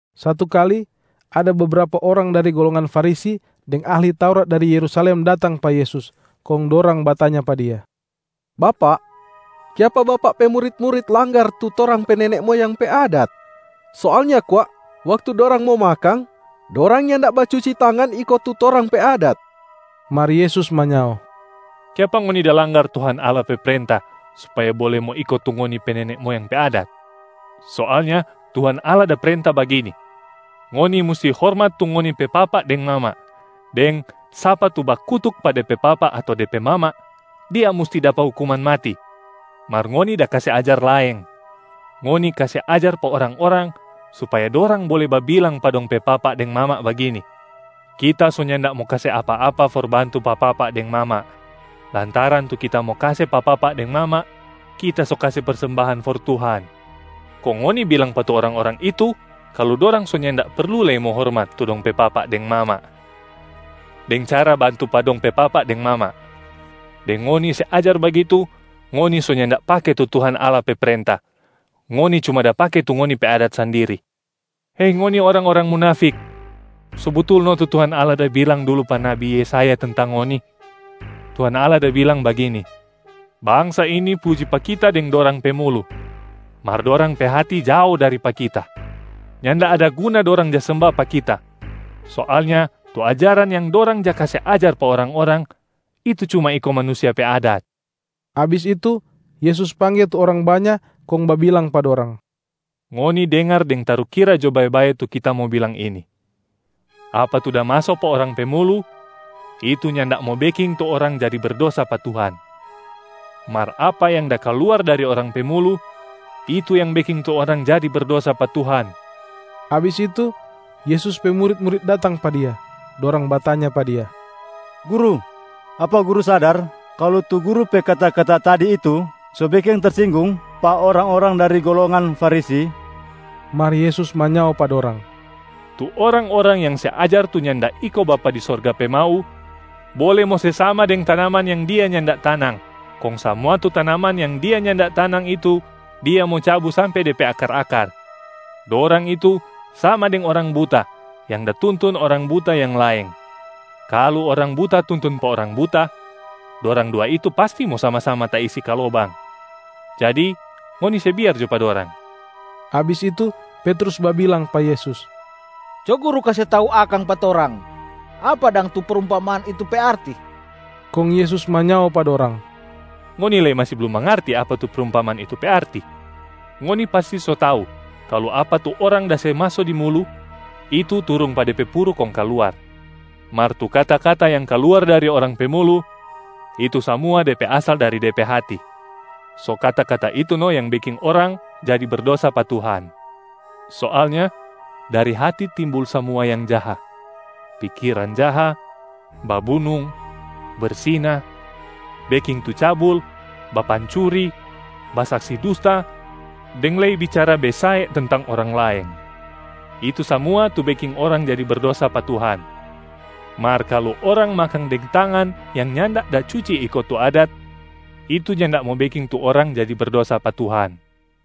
Satu kali, ada bebrapa orang dari golongan Farisi deng ahli Taurat dari Yerusalem datang pa Yesus, kong dorang batanya pa Dia, “Bapak, kiapa Bapak pe murit-murit langgar tu torang pe nene moyang pe adat? Soalnya kwa waktu dorang mo makang, dorang nyanda bacuci tangan iko tu torang pe adat.” Mar Yesus manyao, “Kiapa ngoni da langgar Tuhan Allah pe prenta supaya bole mo iko tu ngoni pe nene moyang pe adat? Soalnya Tuhan Allah da prenta bagini, ‘Ngoni musti hormat tu ngoni pe papa deng mama’, deng ‘Sapa tu bakutuk pa de pe papa ato de pe mama, dia musti dapa hukuman mati.’ Mar ngoni da kase ajar laeng. Ngoni kase ajar pa orang-orang supaya dorang bole babilang pa dong pe papa deng mama bagini, ‘Kita so nyanda mo kase apa-apa for bantu pa papa deng mama, lantaran tu kita mo kase pa papa deng mama, kita so kase persembahan for Tuhan.’ Kong ngoni bilang pa tu orang-orang itu kalu dorang so nyanda perlu lei mo hormat tu dong pe papa deng mama deng cara bantu pa dong pe papa deng mama. Deng ngoni se ajar bagitu, ngoni so nyanda pake tu Tuhan Allah pe prenta, ngoni cuma da pake tu ngoni pe adat sandiri. Hei ngoni orang-orang munafik! So butul no tu Tuhan Allah da bilang dulu pa nabi Yesaya tentang ngoni. Tuhan Allah da bilang bagini, ‘Bangsa ini puji pa Kita deng dorang pe mulu, mar dorang pe hati jao dari pa Kita. Nyanda ada guna dorang ja semba pa Kita. Soalnya tu ajaran yang dorang ja kase ajar pa orang-orang, itu cuma iko manusia pe adat.’” Abis itu, Yesus pangge tu orang banya kong babilang pa dorang, “Ngoni dengar deng tarukira jo bae-bae tu Kita mo bilang ini: apa tu da maso pa orang pe mulu, itu nyanda mo beking tu orang jadi berdosa pa Tuhan. Mar apa yang da kaluar dari orang pe mulu, itu yang beking tu orang jadi berdosa pa Tuhan.” Abis itu, Yesus pe murit-murit datang pa Dia. Dorang batanya pa Dia, “Guru, apa Guru sadar kalu tu Guru pe kata-kata tadi itu so beking tersinggung pa orang-orang dari golongan Farisi?” Mar Yesus manyao pa dorang, “Tu orang-orang yang se ajar tu nyanda iko Bapa di Sorga pe mau bole mo se sama deng tanaman yang Dia nyanda tanang, kong samua tu tanaman yang Dia nyanda tanang itu Dia mo cabu sampe de pe akar-akar. Dorang itu sama deng orang buta yang da tuntun orang buta yang laeng. Kalu orang buta tuntun pa orang buta, dorang dua itu pasti mo sama-sama taisi ka lobang. Jadi ngoni se biar jo pa dorang.” Abis itu Petrus babilang pa Yesus, “Co Guru kase tau akang pa torang apa dang tu prumpamaan itu pe arti.” Kong Yesus manyao pa dorang, “Ngoni lei masi blum mangarti apa tu prumpamaan itu pe arti? Ngoni pasti so tau kalu apa tu orang da se maso di mulu, itu turung pa de pe puru kong kaluar. Mar tu kata-kata yang kaluar dari orang pe mulu, itu samua de pe asal dari de pe hati, so kata-kata itu no yang beking orang jadi berdosa pa Tuhan. Soalnya dari hati timbul samua yang jaha: pikiran jaha, babunung, bersina, beking tu cabul, bapancuri, basaksi dusta deng lei bicara besae tentang orang laeng. Itu samua tu beking orang jadi berdosa pa Tuhan. Mar kalu orang makang deng tangan yang nyanda da cuci iko tu adat, itu nyanda mo beking tu orang jadi berdosa pa Tuhan.”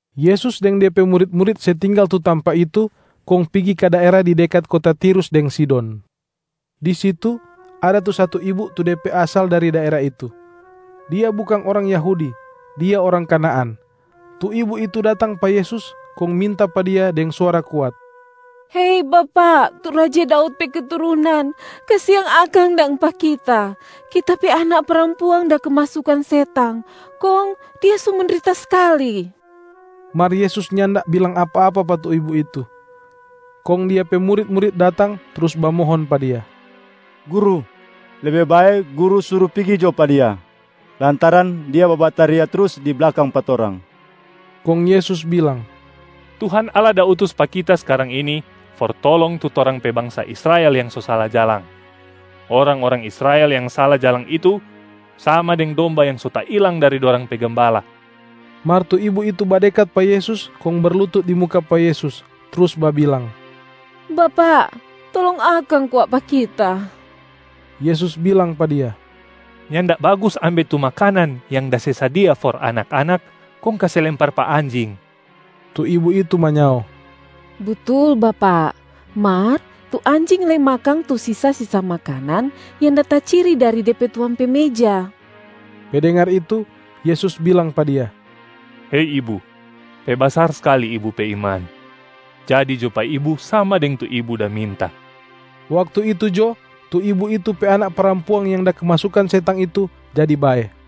Yesus deng Dia pe murit-murit se tinggal tu tampa itu kong pigi ka daera di dekat kota Tirus deng Sidon. Di situ ada tu satu ibu tu de pe asal dari daera itu. Dia bukang orang Yahudi, dia orang Kanaan. Tu ibu itu datang pa Yesus kong minta pa Dia deng suara kuat, “Hei Bapak, tu raja Daud pe keturunan, kasiang akang dang pa kita! Kita pe anak parampuang da kemasukan setang kong dia so mendrita skali.” Mar Yesus nyanda bilang apa-apa pa tu ibu itu. Kong Dia pe murit-murit datang trus bamohon pa Dia, “Guru, lebe bae Guru suru pigi jo pa dia lantaran dia babataria trus di blakang pa torang.” Kong Yesus bilang, “Tuhan Allah da utus pa Kita skarang ini for tolong tu torang pe bangsa Israel yang so sala jalang. Orang-orang Israel yang sala jalang itu sama deng domba yang so tailang dari dorang pe gembala.” Mar tu ibu itu badekat pa Yesus kong berlutut di muka pa Yesus, trus babilang, “Bapak, tolong akang kwa pa kita.” Yesus bilang pa dia, “Nyanda bagus ambe tu makanan yang da se sadia for anak-anak kong kase lempar pa anjing.”a Tu ibu itu manyao, “Butul Bapak, mar tu anjing lei makang tu sisa-sisa makanan yang da taciri dari de pe tuang pe meja.” Pe dengar itu, Yesus bilang pa dia, “Hei ibu, pe basar skali ibu pe iman. Jadi jo pa ibu sama deng tu ibu da minta.” Waktu itu jo, tu ibu itu pe anak parampuang yang da kemasukan setang itu jadi bae.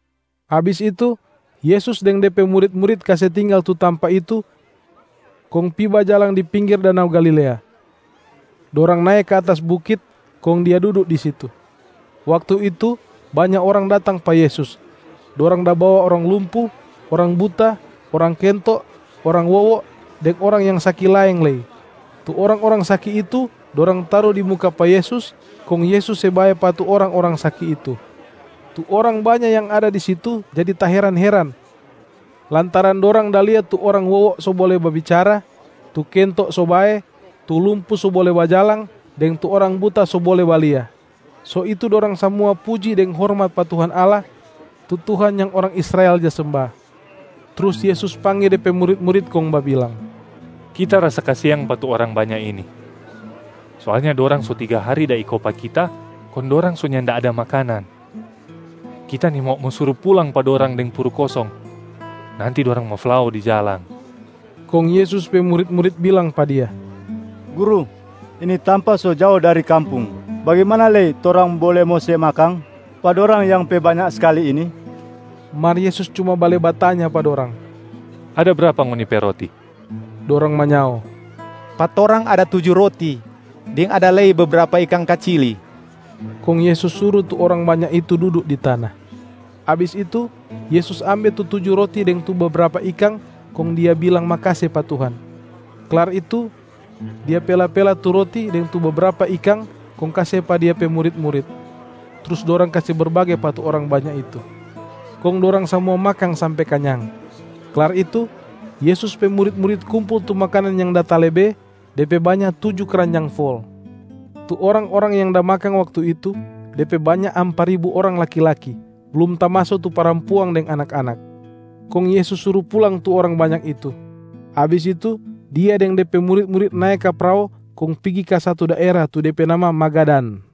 Abis itu, Yesus deng De pe murit-murit kase tinggal tu tampa itu kong pi bajalang di pinggir danau Galilea. Dorang nae ka atas bukit kong Dia dudu di situ. Waktu itu banya orang datang pa Yesus. Dorang da bawa orang lumpu, orang buta, orang kento, orang wowo deng orang yang saki laeng lei. Tu orang-orang saki itu dorang taru di muka pa Yesus, kong Yesus se bae pa tu orang-orang saki itu. Tu orang banya yang ada di situ jadi taheran-heran, lantaran dorang da lia tu orang wowo so bole babicara, tu kento so bae, tu lumpu so bole bajalang deng tu orang buta so bole balia. So itu dorang samua puji deng hormat pa Tuhan Allah, tu Tuhan yang orang Israel ja semba. Trus Yesus pangge De pe murit-murit kong babilang, “Kita rasa kasiang pa tu orang banya ini. Soalnya dorang so tiga hari da iko pa Kita kong dorang so nyanda ada makanan. Kita nimau mo suru pulang pa dorang deng puru kosong, nanti dorang mo flao di jalang.” Kong Yesus pe murit-murit bilang pa Dia, “Guru, ini tampa so jao dari kampung, bagimana lei torang bole mo se makang pa dorang yang pe banya skali ini?” Mar Yesus cuma bale batanya pa dorang, “Ada brapa ngoni pe roti?” Dorang manyao, “Pa torang ada tuju roti deng ada lei bebrapa ikang kacili.” Kong Yesus suru tu orang banya itu dudu di tana. Abis itu Yesus ambe tu tuju roti deng tu bebrapa ikang kong Dia bilang makase pa Tuhan. Klar itu, Dia pela-pela tu roti deng tu bebrapa ikang kong kase pa Dia pe murit-murit, trus dorang kase berbage pa tu orang banya itu. Kong dorang samua makang sampe kanyang. Klar itu, Yesus pe murit-murit kumpul tu makanan yang da talebe, de pe banya tuju kranjang fol. Tu orang-orang yang da makang waktu itu, de pe banya ampa ribu orang laki-laki, blum tamaso tu parampuang deng anak-anak. Kong Yesus suru pulang tu orang banya itu. Abis itu Dia deng De pe murit-murit nae ka prao kong pigi ka satu daera tu de pe nama Magadan.